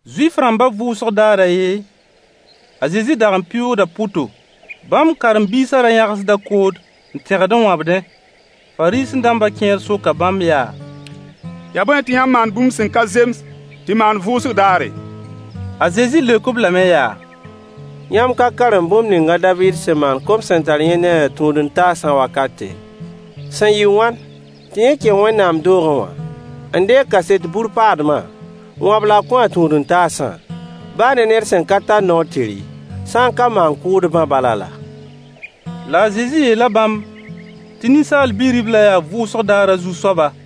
Zuif-rãmbã vʋʋsg daar a yen, a Zezi dag n pɩʋʋgda pʋto. Bãmb karen-biisã ra yãgsda kood n tẽgd n wãbdẽ. Fariisẽ-dãmba kẽer soka bãmb yaa: Yaa bõe tɩ yãmb maand bũmb sẽn ka zems tɩ maan vʋʋsg daare? A Zezi leok-b lame yaa: Yãmb ka karem bũmb ning a Daviid sẽn maan kom sẽn tar yẽ ne a tũud-n-taasã wakate, sẽn yɩ wãn tɩ yẽ kẽ Wẽnnaam doogẽ wã n deeg kaset bur paadma n wãb la a kõ a tũud-n-taasã, baa ne ned sẽn ka tar noor tɩ rɩ, sã n ka maan-kʋʋdbã balã laa? La a Zezi yeela bãmb tɩ Ninsaal Bi-ribla yaa vʋʋsg daarã Zu-soaba.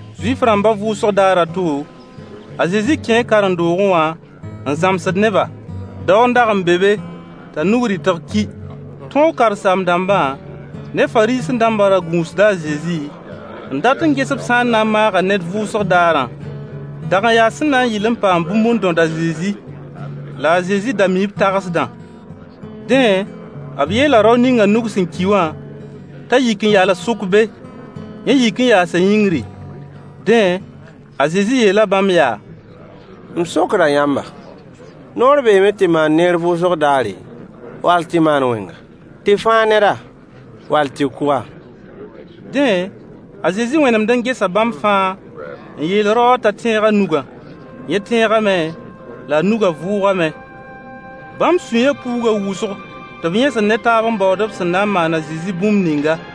Zuif-rãmbã vʋʋsg daar a to, a Zezi kẽe karen-doogẽ wã n zãmsd neba. Dao n dag n be be t'a nug rɩtg ki. Tõog karen-saam-dãmbã ne Fariisẽ-dãmbã da gũusda a Zezi n dat n ges b sã n na n maaga ned vʋʋsg daarã. Dag n yaa sẽn na n yɩl n paam bũmb n dõd a Zezi. La a Zezi da mii b tagsdã. Dẽ, b yeela rao ninga nug sẽn ki wã t'a yik n yals sʋk be. Yẽ yik n yaasa yĩngri. Dẽ, a Zezi yeela bãmb yaa: M sokda yãmba, noor beeme tɩ maan neer vʋʋsg daare, wall tɩ maan wẽnga? Tɩ fãag neda, wall tɩ kʋ-a? Dẽ, a Zezi wẽnemd n gesa bãmb fãa n yeel rao wã t'a tẽeg a nugã. Yẽ tẽegame la a nugã vʋʋgame. Bãmb sũyã puuga wʋsg tɩ b yẽsd ne taab n baood b sẽn na n maan a Zezi bũmb ninga.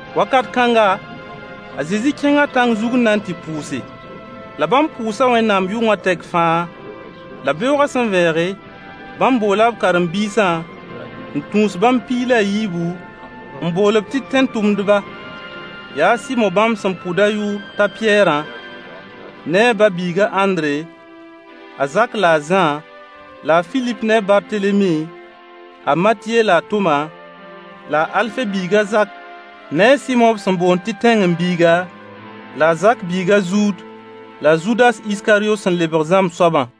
Wakat kãnga, a Zezi kẽnga tãng zug n na n tɩ pʋʋse. La bãmb pʋʋsa Wẽnnaam yʋngã tɛk fãa. La beoogã sẽn vẽege, bãmb boola b karen-biisã n tũus bãmb piig la a yiibu, n bool-b tɩ tẽn-tʋmdba. Yaa a Sɩmo bãmb sẽn pʋd a yʋʋr t'a Pɩyɛɛrã, ne a ba-biiga Ãndre, a Zak la a Zã, la a Filip ne a Bartelemi, a Matye la a Toma, la a Alfe biig a Zak ne a Sɩmo b sẽn boond tɩ zelot, la a Zak biig a Zuud, la a Zudas Iskaryo sẽn lebg zãmb soabã.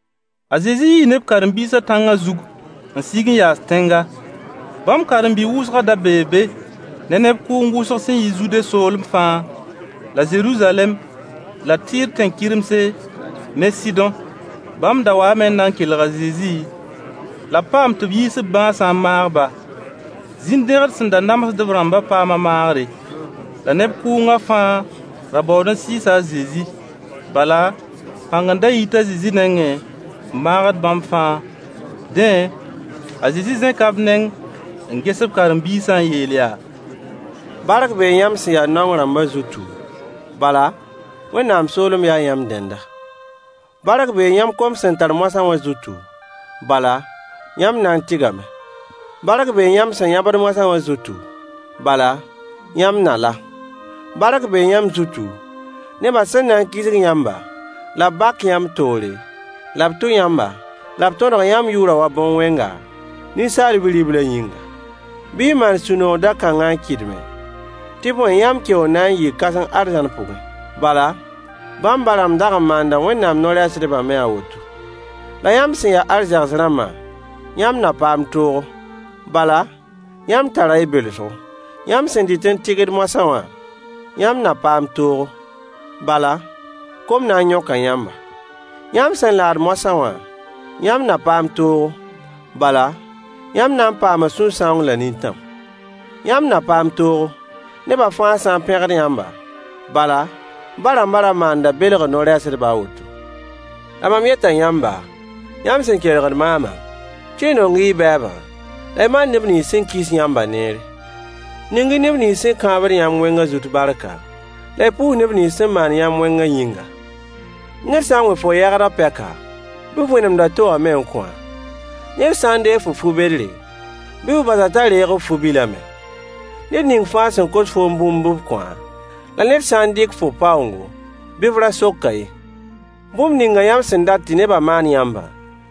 A Zezi yii ne b karen-biisã tãngã zug n sig n yaas tẽnga. Bãmb karen-bi wʋsgã da bee be ne neb kʋʋng wʋsg sẽn yi Zude soolem fãa, la Zeruzalɛm la Tɩɩr tẽn-kɩremse ne Sɩdõ. Bãmb da waame n na n kelg a Zezi, la b paam tɩ b yiis b bãasã n maag-ba. Zĩn-dẽgd sẽn da namsd-b rãmbã paama maagre. La neb kʋʋngã fãa ra baood n sɩɩs a Zezi. Bala, pãng n da yit a Zezi nengẽ n maagd bãmb fãa. Dẽ, a Zezi zẽka b neng n ges b karen-biisã n yeel yaa: bark bee yãmb sẽn ya naong rãmba zutu, bala, Wẽnnaam soolem yaa yãmb dẽnda. Bark bee yãmb kom sẽn tar moasã wã zutu, bala, yãmb na n tɩgame. Bark bee yãmb sẽn yãbd moasã wã zutu, bala, yãmb na la. Bark bee yãmb zutu, nebã sẽn na n kisg yãmba, la b bak yãmb toore, la b tʋ yãmba, la b tõdg yãmb yʋʋrã wa bõn-wẽnga, Ninsaal Bi-riblã yĩnga. Bɩ y maan sũ-noog da-kãnga n kɩdme, tɩ bõe yãmb keoor na n yɩɩ kãseng arzãn pʋgẽ. Bala, bãmb ba-rãmb dag n maanda Wẽnnaam no-rɛɛsdbã me a woto. La yãmb sẽn ya arzegs rãmbã, yãmb na paam toogo, bala, yãmb tara y belsgo. Yãmb sẽn dɩt n tɩgd moasã wã, yãmb na paam toogo, bala, kom na n yõka yãmba. Yãmb sẽn laad moasã wã, yãmb na paam toogo, bala, yãmb na n paama sũ-sãoong la nintãm. Yãmb na paam toogo, neba fãa sã n pẽgd yãmba, bala, ba-rãmba ra maanda belgr no-rɛɛsdbã a woto. La mam yeta yãmba, yãmb sẽn kelgd maamã, tɩ y nong y bɛɛbã, la y maan neb nins sẽn kis yãmbã neere. Ning-y neb nins sẽn kãabd yãmb wẽngã zut barka, la y pʋʋs neb nins sẽn maand yãmb wẽngã yĩnga. Ned sã n wẽ fo yɛgd pɛka, bɩ f wẽnemd a to wã me n kõ-a. Ned sã n deeg fo fu-bedre, bɩ f bas-a t'a reeg f fu-bilã me. Ned ning fãa sẽn kos foom bũmb bɩ f kõ-a, la ned sã n dɩk fo paoongo, bɩ f ra sok-a ye. Bũmb ninga yãmb sẽn dat tɩ neba maan yãmbã,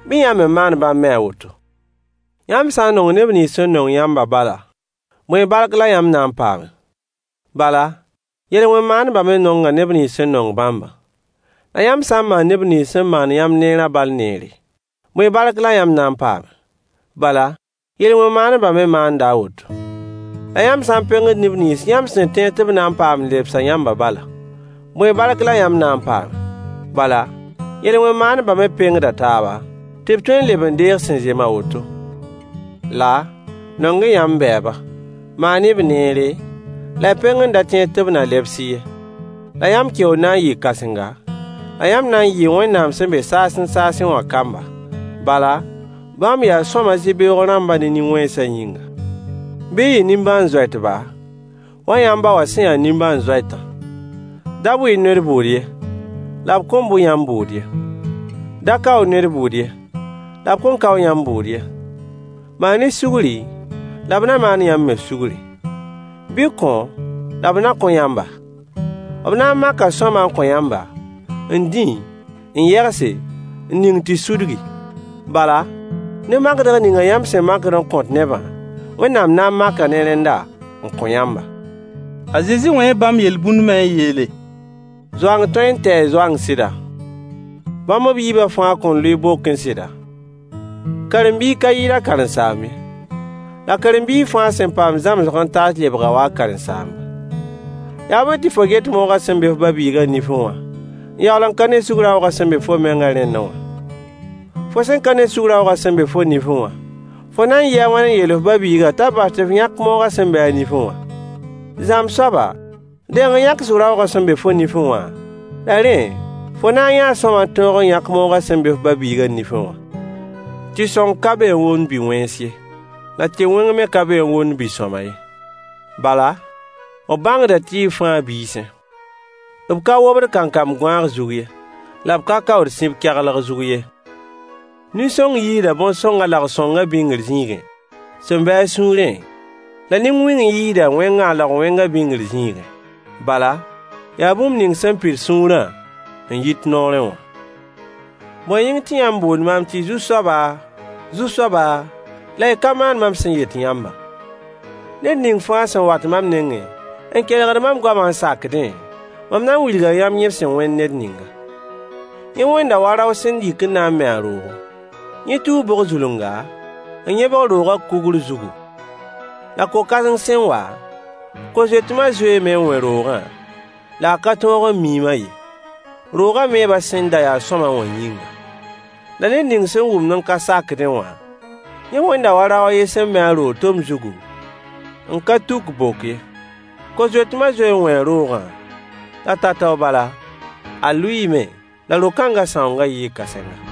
bɩ yãmb me maan bãmb me a woto. Yãmb sã nong neb nins sẽn nong yãmbã bala, bõe bark la yãmb na n paame? Bala, yel-wẽn maandbã me nonga neb nins sẽn nong bãmbã. La yãmb sã n maand neb nins sẽn maand yãmb neerã bal neere, bõe bark la yãmb na n paame? Bala, yel-wẽn maandbã me maanda a woto. La yãmb sã n pengd neb nins yãmb sẽn tẽed tɩ b na n paam n lebsa yãmbã bala, bõe bark la yãmb na n paame? Bala, yel-wẽn maandbã me pengda taaba, tɩ b tõe n leb n deeg sẽn zem a woto. La, nong-y yãmb bɛɛba. Maan-y-b neere, la y peng n da tẽed tɩ b na lebs-y ye. La yãmb keoor na n yɩɩ kãsenga, la yãmb na n yɩɩ Wẽnnaam sẽn be saasẽ saasẽ wã kamba. Bala, bãmb yaa sõama zɩ-beoog rãmbã ne nin-wẽnsã yĩnga. Bɩ y yɩ nimbãan-zoɛtba, wa yãmb ba wã sẽn ya nimbãan-zoɛtã. Da bʋ-y ned bʋʋd ye, la b kõn bʋ yãmb bʋʋd ye. Da kao-y ned bʋʋd ye, la b kõn kao yãmb bʋʋd ye. Maan-y sugri, la b na maan yãmb me sugri. Bɩ y kõ la b na kõ yãmba. B na n maka sõama n kõ yãmba, n dĩ, n yegse, n ning tɩ sudgi. Bala, ne makdg ninga yãmb sẽn makd n kõt nebã, Wẽnnaam na n maka ne rẽnda n kõ yãmba. A Zezi wẽe bãmb yel-bũnd me n yeele: Zoang tõe n tɛɛ zoang sɩda? Bãmb b yiibã fãa kõn lʋɩ bokẽ sɩda? Karen-biig ka yɩɩd a karen-saamb ye. La karen-biig fãa sẽn paam zãmsg n taas lebga wa a karen-saamba. Yaa bõe tɩ fo get moogã sẽn be f ba-biigã nifẽ wã, n yaool n ka ne sug-raoogã sẽn be fo mengã rẽndẽ wã? Fo sẽn ka ne sug-raoogã sẽn be fo nifẽ wã, fo na n yɩɩ a wãn n yeel f ba-biigã t'a bas tɩ f yãk moogã sẽn be a nifẽ wã? Zãmb soaba, deng n yãk sug-raoogã sẽn be fo nifẽ wã, la rẽ, fo na n yãa sõama n tõog n yãk moogã sẽn be f ba-biigã nifẽ wã. Tɩ-sõng ka be n womd bi-wẽns ye, la tɩ-wẽng me ka be n womd bi-sõama ye. Bala, b bãngda tɩɩg fãa a biisẽ. B ka wobd kankam gõaag zug ye, la b ka kaood sib kɛglg zug ye. Nin-sõng yiisda bõn-sõng a laog-sõngã bĩngr zĩigẽ sẽn be a sũurẽ, la nin-wẽng yiisda wẽnga a laog-wẽngã bĩngr zĩigẽ. Bala, yaa bũmb ning sẽn pid sũurã n yit noorẽ wã. Bõe yĩng tɩ yãmb boond maam tɩ Zu-soaba! Zu-soaba! La y ka maand mam sẽn yet yãmbã? Ned ning fãa sẽn wat mam nengẽ n kelgd mam goama n sakdẽ, mam na n wilga yãmb yẽ sẽn wẽnd ned ninga. Yẽ wẽnda wa rao sẽn yik n na n me a roogo. Yẽ tuu bog-zulunga, n yẽbg roogã kugr zugu. La ko-kãseng sẽn wa, ko-zoetma zoeeme n wẽ roogã, la a ka tõog n miim-a ye, roogã meebã sẽn da ya sõama wã yĩnga. La ned ning sẽn wʋmd n ka sakdẽ wã, yẽ wẽnda wa rao a yen sẽn me a roog tom zugu, n ka tuk bok ye. Ko-zoetma zoee n wẽe roogã, la tao-tao bala, a lʋɩɩme, la ro-kãnga sãoongã yɩɩ kãsenga.